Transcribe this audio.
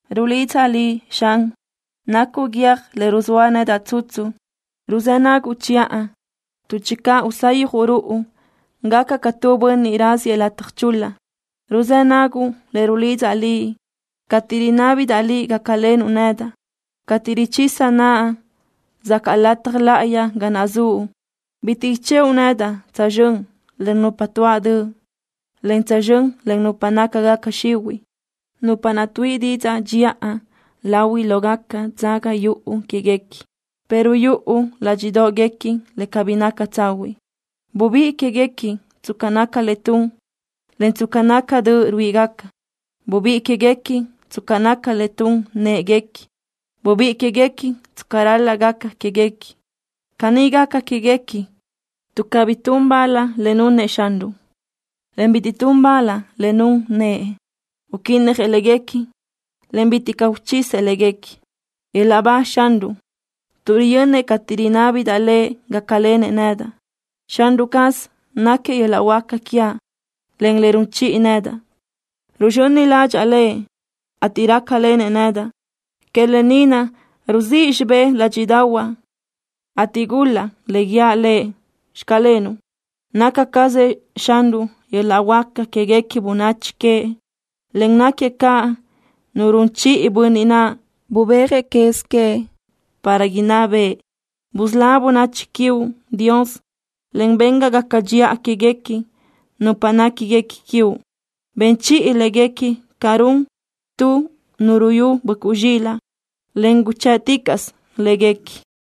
Rulidzaʼ Liʼ, Xan. Nacuʼ Guiö́j le ruzóa nedaʼ tsutsu. Ruzë́ naguʼ chiʼa, tuʼ channö usayjuʼ ruʼu, gacaʼ ca tu bönniʼ raziëʼ lataj chul-la. Ruzë́ naguʼ le rulidzaʼ Liʼ cateʼ rinábidaʼ Liʼ gácalenuʼ nedaʼ, cateʼ richisaʼ naʼa zacaʼ Lataj Láʼayi ga naʼ zuʼ. Bitiʼ ichëʼu nedaʼ tsözxö́n len nupa tuáʼ döʼ, en tsözxö́n len nupa nácagaca xihuiʼ, nupa naʼ tuíʼi didzaʼ dxiʼa lahuiʼ lógaca dzaga yuʼu quéguequi, pero yuʼu ládxiʼdoʼguequi le cabí naca tsahuiʼ. Bubíʼi quéguequi tsca naca le tun, en tsca naca döʼ ruíʼigaca. Bubíʼi quéguequi tsca naca le tun në́ʼeguequi. Bubíʼi quéguequi tsca ral-laʼ gaca quéguequi. Caní gaca quéguequi tuʼ cabí tun bal le nunëʼ Xanruʼ, en bitiʼ tun bal le nun nëʼë. Uquínnajëʼ léguequi, en bitiʼ caʼ uchisëʼ léguequi. ¡Yöl-laʼ ba Xanruʼ, tuʼ riyönnëʼ cateʼ rinábidaʼ Lëʼ gácalenëʼ nedaʼ! Xanruʼ caz náquiëʼ yöl-laʼ huáca quiaʼ, en le run chiʼi nedaʼ. Ruzxöni ládxaʼa Lëʼ, ateʼ rácalenëʼ nedaʼ. Que lë ni naʼ ruzíʼ xibë́ʼ ládxiʼdaʼahuaʼ, ateʼ gul-laʼ le guíaʼ Lëʼ: “Xclenuʼ.” Naca cazëʼ Xanruʼ yöl-laʼ huáca quéguequi bönachi queëʼ, en náquiëʼ caʼ Nu run chiʼi Bönniʼ naʼ bubéajëʼ quez queëʼ para inná bëʼë. Busölá bönachi quiuʼ, Dios, en ben ga gaca dxiʼa quéguequi nupa néquiguequi quiuʼ. Ben chiʼi léguequi ca run tu nu ruyú böʼcuʼ zxilaʼ, en guchë́ʼticaʼsö léguequi.